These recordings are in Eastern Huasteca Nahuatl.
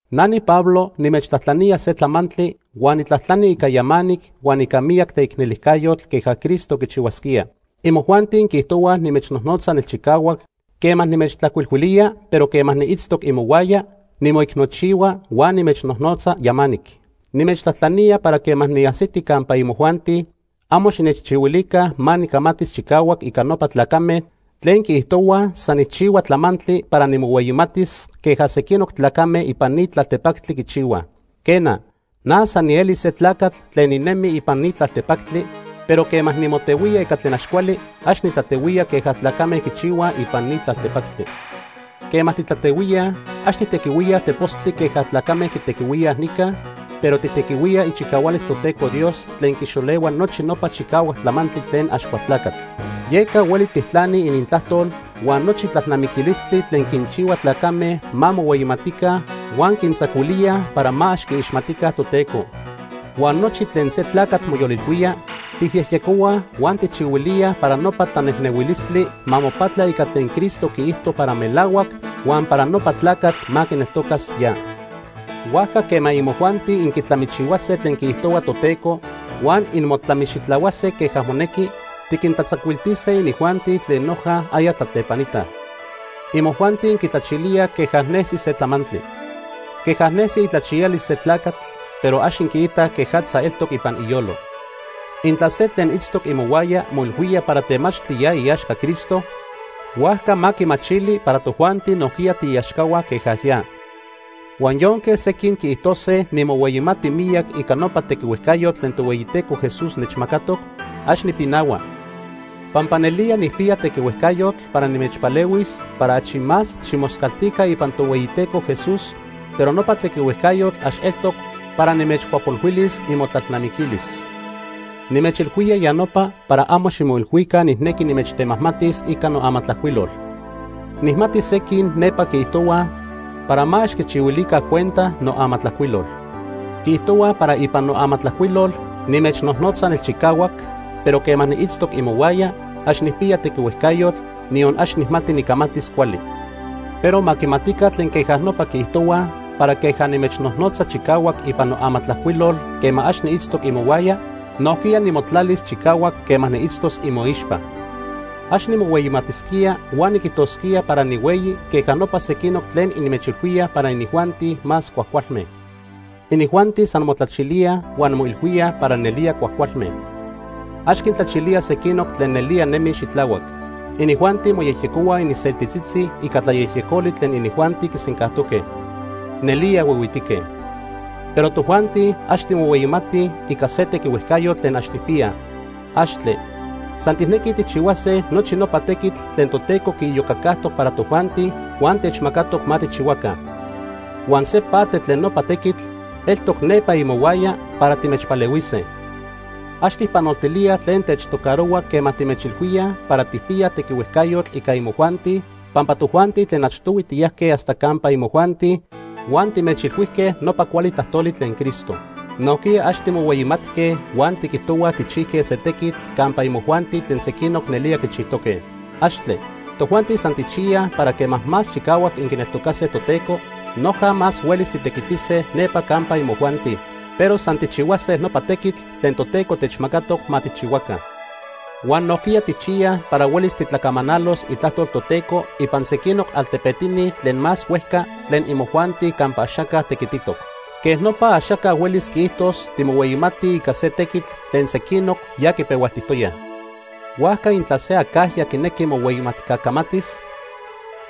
Na niPablo nimechtlajtlanía se tlamantli huan nitlajtlani ica yamanic huan ica miyac teicnelijcayotl queja Cristo quichihuasquía. Imojuanti inquiijtohuaj nimechnojnotza nelchicahuac quema nimechtlajcuilhuilía, pero quema niitztoc imohuaya, nimoicnochihua huan nimechnojnotza yamanic. Nimechtlajtlanía para quema niajsiti campa imojuanti, amo xinechchihuilica ma nicamatis chicahuac ica nopa tlacame tlen quiijtohuaj san nijchihua tlamantli para nimohueyimatis queja sequinoc tlacame ipan ni tlaltepactli quichihuaj. Quena, na san nieli se tlacatl tlen ninemi ipan ni tlaltepactli, pero quema nimotehuía ica tlen ax cuali, ax nitlatehuía queja tlacame quichihuaj ipan ni tlaltepactli. Quema titlatehuíaj, ax tijtequihuíaj tepostli queja tlacame quitequihuíaj nica, pero tijtequihuíaj ichicahualis Toteco Dios tlen quixolehua nochi nopa chicahuac tlamantli tlen Axcualtlacatl. Yeca hueli tijtlanij inintlajtol huan nochi tlalnamiquilistli tlen quinchihuilíaj tlacame ma mohueyimatica huan quintzacuilíaj para ma ax quiixmatica Toteco. Huan nochi tlen se tlacatl moyolilhuía, tijyejyecohuaj huan tijchihuilíaj para nopa tlanejnehuilistli ma mopatla ica tlen Cristo quiijto para melahuac huan para nopa tlacatl ma quineltocas ya. Huajca quema imojuanti inquitlamichihuase tlen quiijtohua Toteco huan inmotlamixitlahuase queja monequi, tiquintlatzacuiltise inijuanti tlen noja aya tlatlepanitaj. Imojuanti inquitlachilíaj queja nesi se tlamantli. Queja nesi itlachiyalis se tlacatl, pero ax inquiitaj quejatza eltoc ipan iyolo. Intla se tlen itztoc imohuaya moilhuía para temachtli ya iaxca Cristo, huajca ma quimachili para tojuanti nojquiya tiiaxcahua queja ya. Huan yonque sequin quiijtose nimohueyimati miyac ica nopa tequihuejcayotl tlen Tohueyiteco Jesús nechmacatoc, ax nipinahua. Pampa nelía nijpiya tequihuejcayotl para nimechpalehuis para achi más ximoscaltica ipan Tohueyiteco Jesús, pero nopa tequihuejcayotl ax eltoc para nimechcuapolhuilis imotlalnamiquilis. Nimechilhuía ya nopa para amo ximoilhuica nijnequi nimechtemajmatis ica noamatlajcuilol. Nijmati sequin nepa quiijtohuaj para ma ax quichihuilica cuenta noamatlajcuilol. Quiijtohuaj para ipan noamatlajcuilol nimechnojnotza nelchicahuac, pero quema niitztoc imohuaya, ax nijpiya tequihuejcayotl, niyon ax nijmati nicamatis cuali. Pero ma quimatica tlen queja nopa quiijtohuaj para queja nimechnojnotza chicahuac ipan amatlajcuiloli quema ax niitztoc imohuaya, nojquiya nimotlalis chicahuac quema niitztos imoixpa. Ax nimohueyimatisquía huan niquijtosquía para nihueyi queja nopa sequinoc tlen inmechilhuíaj para inijuanti más cuajcualme. Inijuanti san motlachilíaj huan moilhuíaj para nelía cuajcualme. Ax quintlachilíaj sequinoc tlen nelía nemij xitlahuac. Inijuanti moyejyecohuaj ininseltitzitzi ica tlayejyecoli tlen inijuanti quisencajtoque. ¡Nelía huihuitique! Pero tojuanti, ax timohueyimatij ica se tequihuejcayotl tlen ax tijpiyaj. ¡Axtle! San tijnequij tijchihuase nochi nopa tequitl tlen Toteco quiiyocacajtoc para tojuanti huan techmacatoc ma tijchihuaca. Huan se parte tlen nopa tequitl eltoc nepa imohuaya para timechpalehuise. Ax tijpanoltilíaj tlen techtocarohua quema timechilhuíaj para tijpiyaj tequihuejcayotl ica imojuanti, pampa tojuanti tlen achtohui tiyajque hasta campa imojuanti huan timechilhuijque nopa cuali tlajtoli tlen Cristo. Nojquiya ax timohueyimatque huan tiquijtohuaj tijchijque se tequitl campa imojuanti tlen sequinoc nelía quichijtoque. ¡Axtle! Tojuanti san tijchiyaj para quema más chicahuac inquineltocase Toteco, noja más huelis titequitise nepa campa imojuanti, pero san tijchihuase nopa tequitl tlen Toteco techmacatoc ma tijchihuaca. Huan nojquiya tijchiyaj para huelis titlacamanalos itlajtol Toteco ipan sequinoc altepetini tlen más huejca tlen imojuanti campa axaca tequititoc. Quej nopa axaca huelis quiijtos timohueyimatij ica se tequitl tlen sequinoc ya quipehualtijtoyaj. Huajca intla se acajya quinequi mohueyimatca camatis,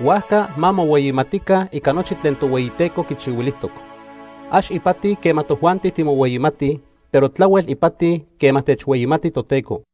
huajca ma mohueyimatica ica nochi tlen Tohueyiteco quichihuilijtoc. Ax ipati quema tojuanti timohueyimatij, pero tlahuel ipati quema techhueyimati Toteco.